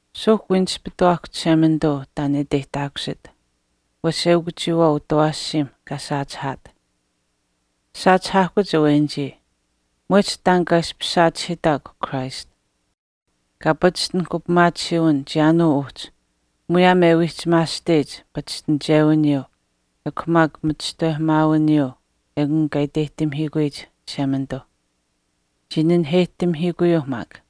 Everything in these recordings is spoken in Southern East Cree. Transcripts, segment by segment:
Suuhk wii nispituwaahkw Chishemanituu taan e iteyihtaakusit, wesh eukw chiyawaau utawaashiimh kaa saachihaat. Saachihaahkuch awenichii, mwehch taan kaa ishpish saachihiitahkw Christ. Kaa pachishtinahk upimaatisiiwin chiyaanuu uhchi muyaam e wiihchimaasteyich pachishtinichewiniyuu ekw maak machishtawehamaawiniyuu ekun kaa iteyihtamihiikuyich Chishemanituu. Chii naheyihtamihiikuyuuh maak.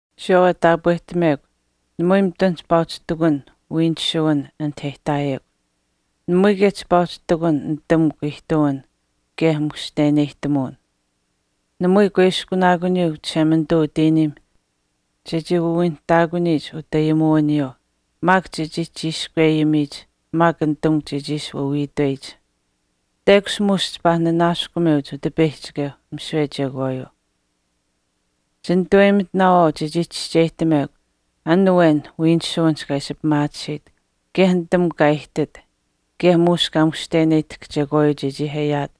Chiyawaau e taapwehtamekw namui mitun chipaa uhchi ihtakun wiinisuwin anit e ihtaayekw. Namui kaye chipaa uhchi ihtakun nitamukw ihtuwin kaye mushteneyihtamuwin. Namui kuiskunaakuniyuu Chishemanituu utiiniim chechii wawiinihtaakuniyich utayimuwiniyuu maak chechii chiishkwe ayimiyich maak nitamukw chechii ishi wawiitweyich. Teyakuch muush chipaa nanaaskumeuch Utipeyihchikeuh misiwe chekwaayuu. Chinitaweyimitinaawaau chechii chischeyihtamekw an awen wiinisuwinihch kaa ishi pimaatisiit kaye nitamukw kaa aihtit kaye muush kaa mushteneyihtahk chekwaayuu chechii ayaat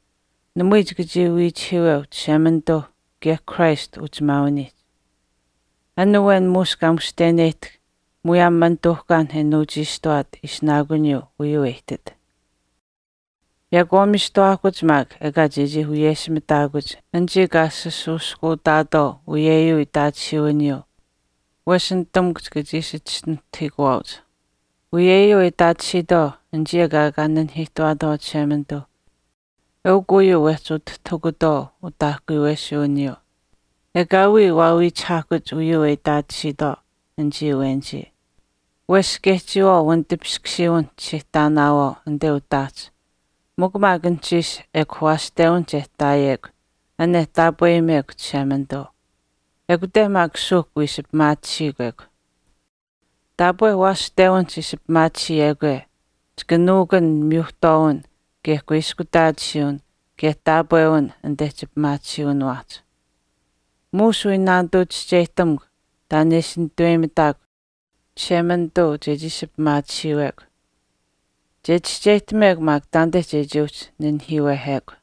namui chika chii wiichihiiweu Chishemanituu kaye Christ uchimaawiniihch. An awen muush kaa mushteneyihtahk muyaam manituuhkaanh e nuuchiishtuwaat ishinaakuniyuu uyuu e ihtit. Yaakwaamiistuwaahkuch maak ekaa chechii wiyeshimitaakuch anichii kaa sasuuskuutaatwaau uyeyuu itaatisiiwiniyuu wesh nitamukw chika ishi chischinuhtahiikuwaauch. Uyuu e itaatisiitwaau anichii ekaa kaa nanihiihtuwaatwaau Chishemanituuh eukw uyuu wehchi utitahukutwaau utaahkuyuwesuwiniyuu. Ekaawii waawiichihaahkuch uyuu e itaatisiitwaau anichii awenichii. Wesh kaye chiyawaau wanitipiskusiiwinihch chichii ihtaanaawaau anite utaahch, mikw maak anuhchiish ekw waashtewinich e ihtaayekw an uhchi e taapweyimekw Chishemanituu. ekute maak suuhk wiishi pimaatisiikw ekw. Taapwe waashtewinihch ishi pimaatisiyekwe chika nuukun miyuhtwaawin kaye kuiskutaatisiiwin kaye taapwewin anite chipimaatisiiwiniwaahch. Muush wii naanituu chischeyihtamukw taan e ishi nitaweyimitaakw Chishemanituu chechii ishi pimaatisiiwekw. Che chischeyihtamekw maak taanite chechii uhchi nanihiiwehekw.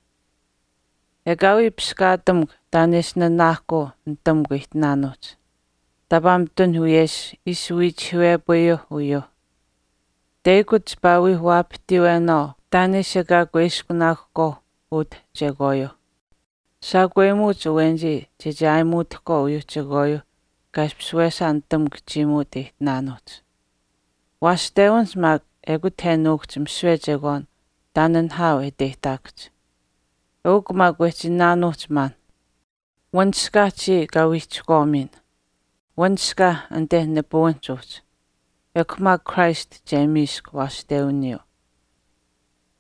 Ekaawii piskaatamukw taan e ishi nanaahkuu nitamukw ihtinaanuuhch, taapaa mitun wiyesh ishi wiichihiiwepayuuh uyuuh. Teyakuch chipaa wii waapatiiwenaawaau taan e ishi ekaa kuiskunaakuhkwaauh utuuh chekwaayuuh. Shaakweyimuuch awenichii chechii ayimitutahkwaau uyuuh chekwaayuuh kaa ishpish wesaa nitamukw chiimuut aihtinaanuuhch. Waashtewinihch maak ekut e nuukuhch misiwe chekwaan taan nihaau e iteyihtaakuhch. Eukw maak wehch iinaanuuhch maan, “Wanishkaah chiya kaa wiihchihkwaamuyin, wanishkaah anit nipuwinihch uhchi. Ekw maak Christ che miisk waashtewiniyuu.”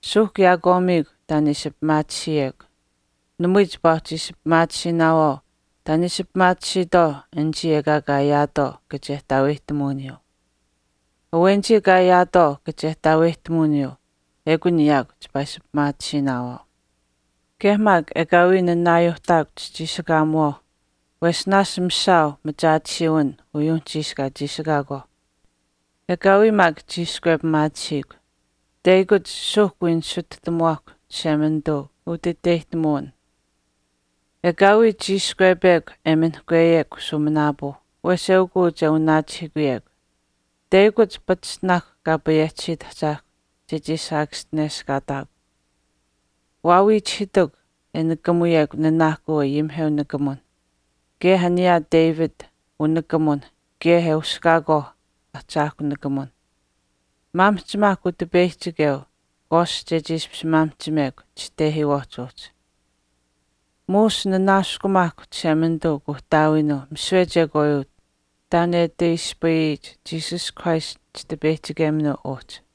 Suuhk yaakwaamiikw taan e ishi pimaatisiyekw. Namui chipaa uhchi ishi pimaatisiinaawaau taan e ishi pimaatisiitwaau anichii ekaa kaa ayaatwaau kachehtaaweyihtamuwiniyuu. Awenichii kaa ayaatwaau kachehtaaweyihtamuwiniyuu ekun yaakw chipaa ishi pimaatisiinaawaau. Kaye maak ekaawii nanaayuuhtaakw chichiishikaamiwaauh wesh naashch mishaau machaatisiiwin uyuuh anuhchiish kaa chiishikaakwaauh. Ekaawii maak chiishkwepimaatisiikw. Teyakuch suuhk wii nisituhtamuwaahkw Chishemanituu utiteyihtamuwin. Ekaawii chiishkwepekw e minihkweyekw shuuminaapuu, wesh eukuu che wanaachihiikuyekw. Teyakuch pachishtinaahkw Payehchi Ahchaahkw chechii saakaschineshkaataakw. Waawiichihiitukw e nikamuyekw nanaahkuu ayimiheu nikamuwinh, kaye aniyuuh David unikamuwinh kaye e uskaakwaau ahchaahkw nikamuwin nikamukw. Maamihchimaahkw Utipeyihchikeu kwaast chechii ishpish maamihchimekw chitehiiwaahch uhchi. Muush nanaaskumaahkw Chishemanituu Kuuhtaawiinuu misiwe chekwaayuu taan e ati ispayiyich Jesus Christ Chitipeyihchikeminuu uhchi.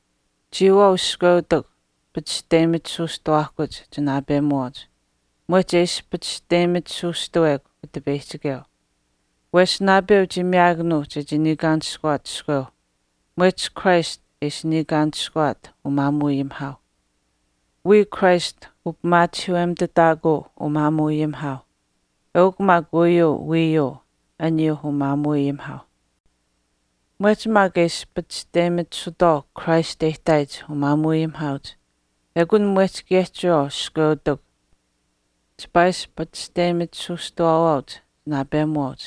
Chiyawaau iskweutikw pachishteyimitisuustawaahkuch chinaapemuwaauch mwehch e ishi pachishteyimitisuustawekw Utipeyihchikeu. Wesh naapeu chii miyaakanuu chechii niikaanishkuwaat wiichiskweu mwehch Christ e ishi niikaanishkuwaat umaamuuayimihaauh. Wiya Christ upimaachihiiwemitutaakuu umaamuuayimihaauh, eukw maak uyuu wiiyuu aniyuuh umaamuuayimihaauh. Mwehch maak e ishi pachishteyimitisutwaau Christ e ihtaayich umaamuuayimihaauch ekun mwehch kaye chiyawaau iskweutikw chipaa ishi pachishteyimitisuustawaawaauch chinaapemuwaauch.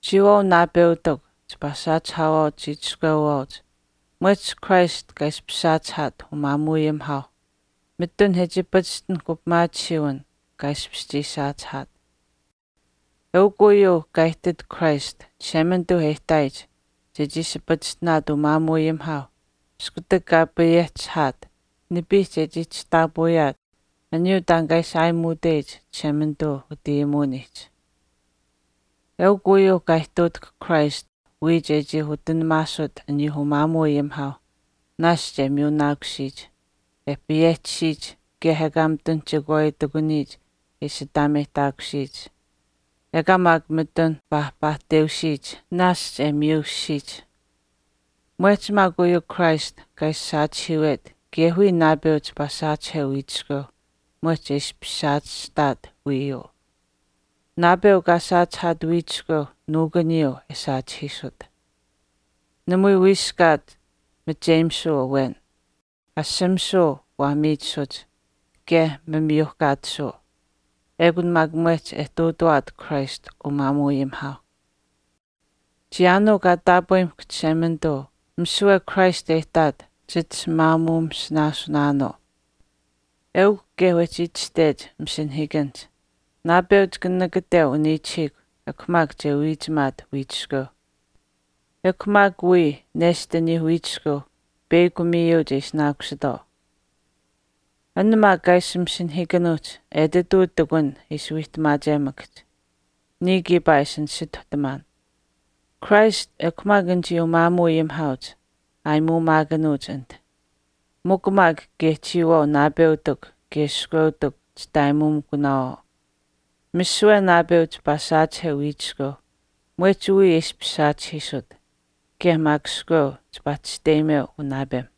Chiyawaau naapeutikw, chipaa saachihaawaauch chiichiskweuwaauch mwehch Christ kaa ishpish saachihaat umaamuuayimihaauh, mitun e chii pachishtinahk upimaatisiiwin kaa ishpish chii saachihaat. Eukw uyuu kaa ihtit Christ Chishemanituu e ihtaayich chechii ishi pachishtinaat umaamuuayimihaauh iskutak kaa payehchihaat, nipiihch e chii chishtaapawiyaat aniyuu taan kaa ishi aayimuuteyich Chishemanituu utayimuwiniihch. Eukw uyuu kaa ihtuutahk Christ wiya chechii utinamaasut aniyuu umaamuuayimihaauh naashch e miyunaakusiyich, e payehchisiyich kaye ekaa mitun chekwaayuu ihtakuniyich e ishi ataameyihtaakusiyich, ekaa mitun paahpaahteusiyich, naashch e miyushishiyich. Mwehch maak uyuu Christ kaa ishi saachihiiwet kaye wiya naapeu chipaa saachiheu wiichiskweu mwehch e ishpish saachihtaat wiiyuu. Naapeu kaa saachihaat wiichishkweu nuukuniyuu e saachihiisut. Namui wiiskaat macheyimisuu awen. Ashamisuu waa miichisuch kaye mamiyuuhkaatisuu. Ekun maak mwehch e ihtuutawaat Christ umaamuuayimihaauh. Chiyaanuu kaa taapweyimahkw Chishemanituu misiwe Christ e ihtaat chit ishi maamuusinaasunaanuu. Eukw kaye wehchi itashtech masinahiikanihch, “Naapeu chika nakateu uniichihiikw ekw maak che wiichimaat wiichiskweu. Ekw maak wiichiskweu peyakw miyu che ishinaakusitwaau.” An maak kaa ishi masinahiikanuuhch etituu ihtakun e ishi wiihtamaachemakahch. Niya kiipaa e ishi nisituhtamaan, Christ ekw maak anichii umaamuuayimihaauch aayimuumaakanuuch anit. Mikw maak kaye chiyawaau naapeutikw kaye iskweutikw chitaayimuumikunaawaau. Misiwe naapeu chipaa saachiheu wiichiskweu mwehch wiya e ishpish saachihiisut. Kaye maak iskweu chipaa chisteyimeu unaapem.